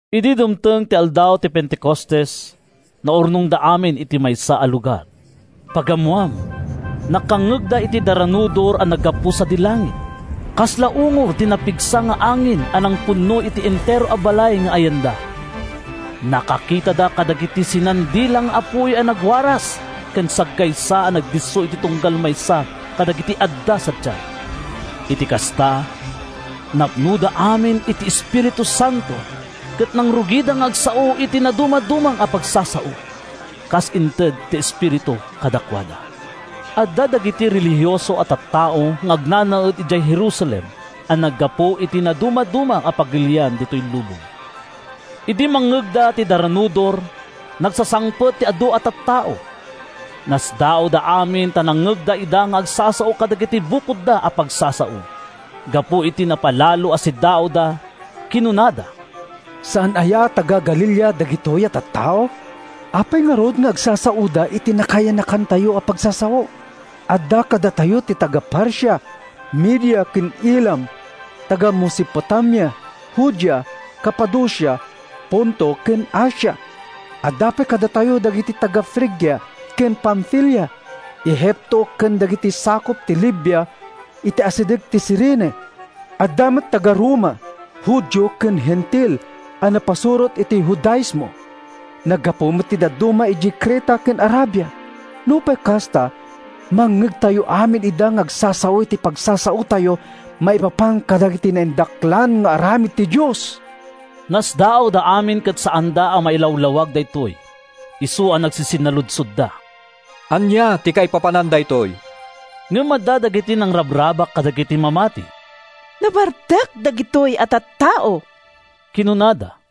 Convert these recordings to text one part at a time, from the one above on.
Idi dumteng ti aldaw ti Pentecostes, naurnongda amin iti maysa a lugar. Pagammoan, nakangngegda iti daranudor a naggapu sadi langit; kasla ungor ti napigsa nga angin a nangpunno iti entero a balay nga ayanda. Nakakitada kadagiti sinan-dila nga apuy a nagwaras ken saggaysa a nagdisso iti tunggal maysa kadagiti adda sadiay. Iti kasta, napnoda amin iti Espiritu Santo ket nangrugida nga agsao iti nadumaduma a pagsasao, kas inted ti Espiritu kadakuada. Adda dagiti relihioso a tattao nga agnanaed idiay Jerusalem a naggapu iti nadumaduma a pagilian ditoy lubong. Idi mangngegda ti daranudor, nagsasangpet ti adu a tattao. Nasdaawda amin ta nangngegda ida nga agsasao kadagiti bukodda a pagsasao. Gapu iti napalalo a siddaawda, kinunada, “Saan aya a taga-Galilea dagitoy a tattao? Apay ngarud nga agsasaoda iti nakayanakantayo a pagsasao? Adda kadatayo ti taga-Partia, Media ken Elam; taga-Mesopotamia, Judea, Capadocia, Ponto ken Asia. Adda pay kadatayo dagiti taga-Frigia ken Pamfilia, Egipto ken dagiti sakup ti Libya, iti asideg ti Cirene. Adda met taga-Roma, Judio ken Hentil a napasurot iti Judaismo. Naggapu met ti dadduma idiay Creta ken Arabia. Nupay kasta, mangngegtayo amin ida nga agsasao iti pagsasaotayo maipapan kadagiti naindaklan nga aramid ti Dios!” Nasdaawda amin ket saanda a mailawlawag daytoy, isu a nagsisinnaludsodda, “Ania ti kaipapanan daytoy?” Ngem adda dagiti nangrabrabak kadagiti mamati. “Nabartek dagitoy a tattao,” kinunada.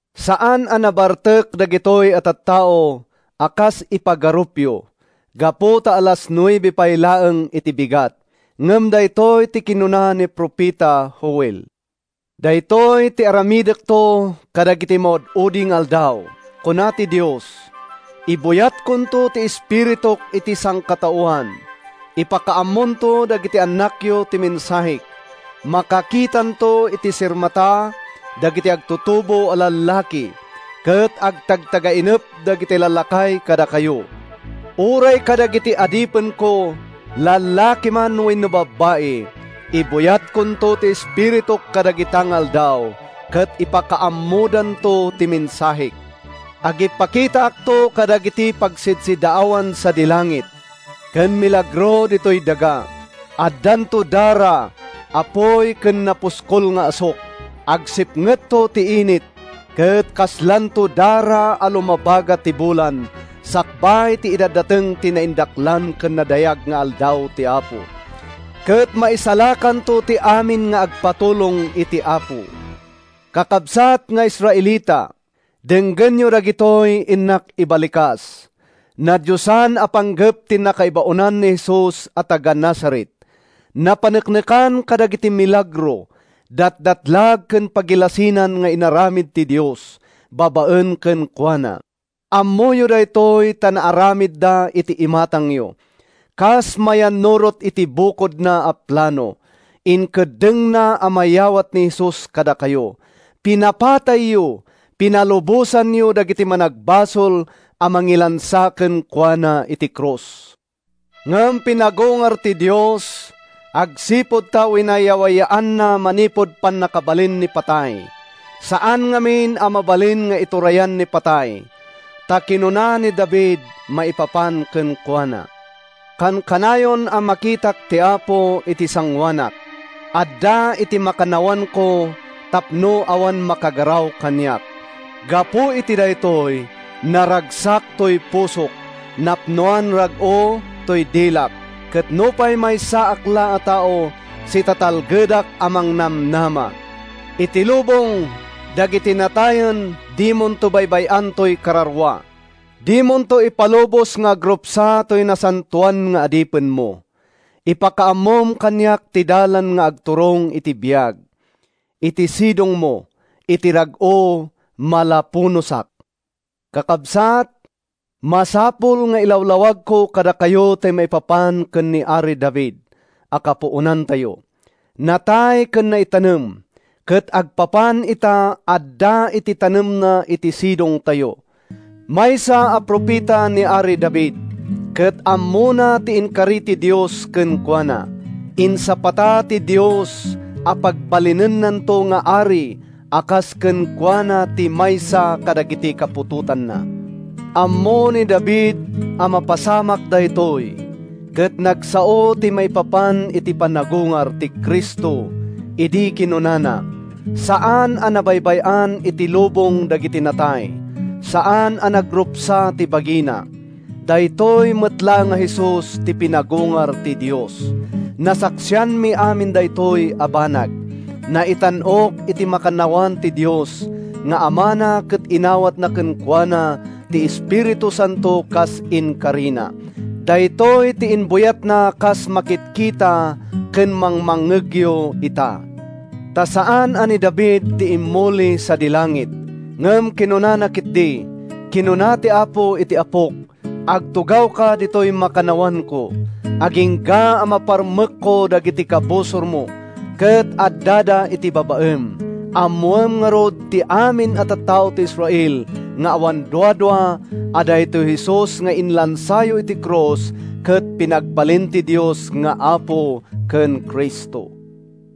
Saan a nabartek dagitoy a tattao a kas ipagarupyo, gapu ta alas nuebe pay laeng iti bigat. Ngem daytoy ti kinuna ni profeta Joel: ‘Daytoy ti aramidekto kadagiti maud-udi nga aldaw, kuna ti Dios, Ibuyatkonto ti Espirituk iti sangkataoan. Ipakaammonto dagiti annakyo ti mensahek; Makakitanto iti sirmata dagiti agtutuboyo a lallaki; Ket agtagtagainepto dagiti lallakay kadakayo. Uray kadagiti adipenko, lalaki man wenno babai, Ibuyatkonto ti Espirituk kadagita nga aldaw, Ket ipakaammodanto ti mensahek. Agipakitaakto kadagiti pagsidsiddaawan sadi langit, Ken milagro ditoy daga. Addanto dara, apuy, ken napuskol nga asuk. Agsipngetto ti init, Ket kaslanto dara a lumabaga ti bulan Sakbay ti idadateng ti naindaklan ken nadayag nga Aldaw ti Apo. Ket maisalakanto ti amin nga agpatulong iti Apo.’ “Kakabsat nga Israelita, denggenyo dagitoy innak ibalikas! Nadiosan a panggep ti nakaibaonan ni Jesus a taga-Nazaret. Napaneknekan kadagiti milagro, datdatlag ken pagilasinan nga inaramid ti Dios babaen kenkuana. Ammoyo daytoy ta naaramidda iti imatangyo. Kas mayannurot iti bukodna a plano, inkeddengna a mayawat ni Jesus kadakayo. Pinapatayyo—pinalubosanyo dagiti managbasol a nangilansa kenkuana iti krus. Ngem pinagungar ti Dios agsipud ta winayawayaanna manipud pannakabalin ni patay. Saan ngamin a mabalin nga iturayan ni patay. Ta kinuna ni David maipapan kenkuana: ‘Kankanayon a makitak ti Apo iti sangoanak; Adda iti makannawanko tapno awan makagaraw kaniak. Gapu iti daytoy, naragsak toy pusok, napnoan rag-o toy dilak; Ket nupay maysaak la a tao, sitatalgedak a mangnamnama. Iti lubong dagiti natay dimonto baybay-an toy kararua; Dimonto ipalubos nga agrupsa toy nasantoan nga adipenmo. Impakaammom kaniak ti dalan nga agturong iti biag. Iti sidongmo, iti rag-o malapunosak.’ “Kakabsat, masapul nga ilawlawagko kadakayo ti maipapan ken ni Ari David a kapuonantayo. Natay ken naitanem, ket agpapan ita adda ti tanemna iti sidongtayo. Maysa a profeta ni Ari David ket ammona ti inkari ti Dios kenkuana. Insapata ti Dios a pagbalinennanto nga ari a kas kenkuana ti maysa kadagiti kaputotanna. Ammo ni David a mapasamakto daytoy ket nagsao ti maipapan iti panagungar ti Cristo idi kinunana: ‘Saan a nabaybay-an iti lubong dagiti natay, Saan a nagrupsa ti bagina.’ Daytoy met laeng a Jesus ti pinagungar ti Dios. Nasaksianmi amin daytoy a banag. Naitan-ok iti makannawan ti Dios nga Amana ket inawatna kenkuana ti Espiritu Santo kas inkarina. Daytoy ti imbuyatna kas makitkita ken mangmangngegyo ita. Ta saan a ni David ti immuli sadi langit, ngem kinunana ketdi: ‘Kinuna ti Apo iti Apok: Agtugawka ditoy makannawanko, Agingga a maparmekko dagiti kabusormo Ket addada iti babaem.’ “Ammoen ngarud ti amin a tattao iti Israel nga awan duadua a daytoy Jesus nga inlansayo iti krus ket pinagbalin ti Dios nga Apo ken Cristo!”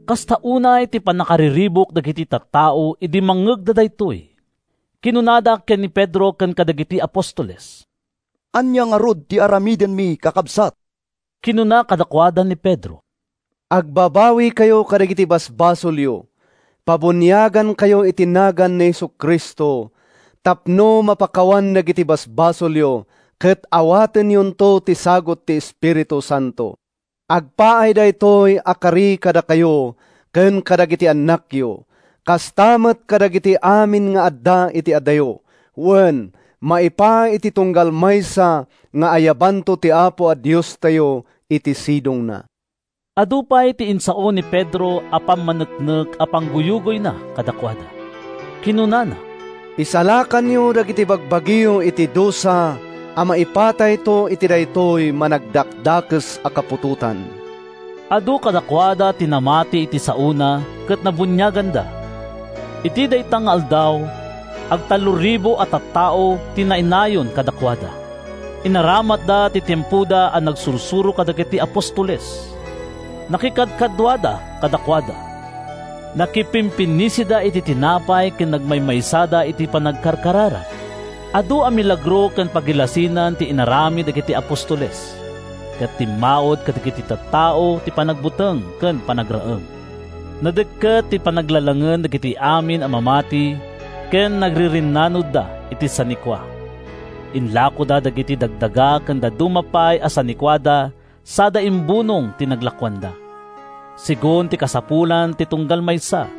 Kasta unay ti pannakariribuk dagiti tattao idi mangngegda daytoy. Kinunada ken ni Pedro ken kadagiti apostoles, “Ania ngarud ti aramidenmi, kakabsat?” Kinuna kadakuada ni Pedro, “Agbabawikayo kadagiti basbasolyo. Pabuniagankayo iti nagan ni Jesu-Cristo tapno mapakawan dagiti basbasolyo ket awatenyonto ti sagut ti Espiritu Santo. Agpaay daytoy a kari kadakayo ken kadagiti annakyo, kasta met kadagiti amin nga adda iti adayo. Wen, maipaay iti tunggal maysa nga ayabanto ti Apo a Diostayo iti sidongna.” Adu pay ti insao ni Pedro a pammaneknek a pangguyugoyna kadakuada. Kinunana, “Isalakanyo dagiti bagbagiyo iti dusa a maipatayto iti daytoy managdakdakes a kaputotan!” Adu kadakuada ti namati iti saona ket nabuniaganda. Iti dayta nga aldaw, ag-3,000 a tattao ti nainayon kadakuada. Inaramatda ti tiempoda a nagsursuro kadagiti apostoles. Nakikadkaduada kadakuada, nakipimpinnisida iti tinapay ken nagmaymaysada iti panagkarkararag. Adu a milagro ken pagilasinan ti inaramid dagiti apostoles, ket timmaud kadagiti tattao ti panagbuteng ken panagraem. Nadekket ti panaglalangen dagiti amin a mamati ken nagririnnanudda iti sanikua. Inlakoda dagiti dagdaga ken dadduma pay a sanikuada sada imbunong ti naglakoanda, segun ti kasapulan ti tunggal maysa.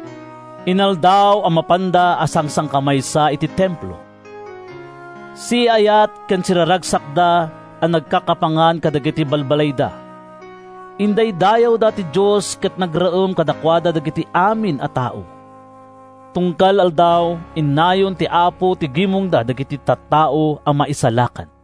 Inaldaw a mapanda a sangsangkamaysa iti Templo. Siaayat ken siraragsakda a nagkakapangan kadagiti balbalayda. Indaydayawda ti Dios ket nagraem kadakuada dagiti amin a tao. Tunggal aldaw, innayon ti Apo iti gimongda dagiti tattao a maisalakan.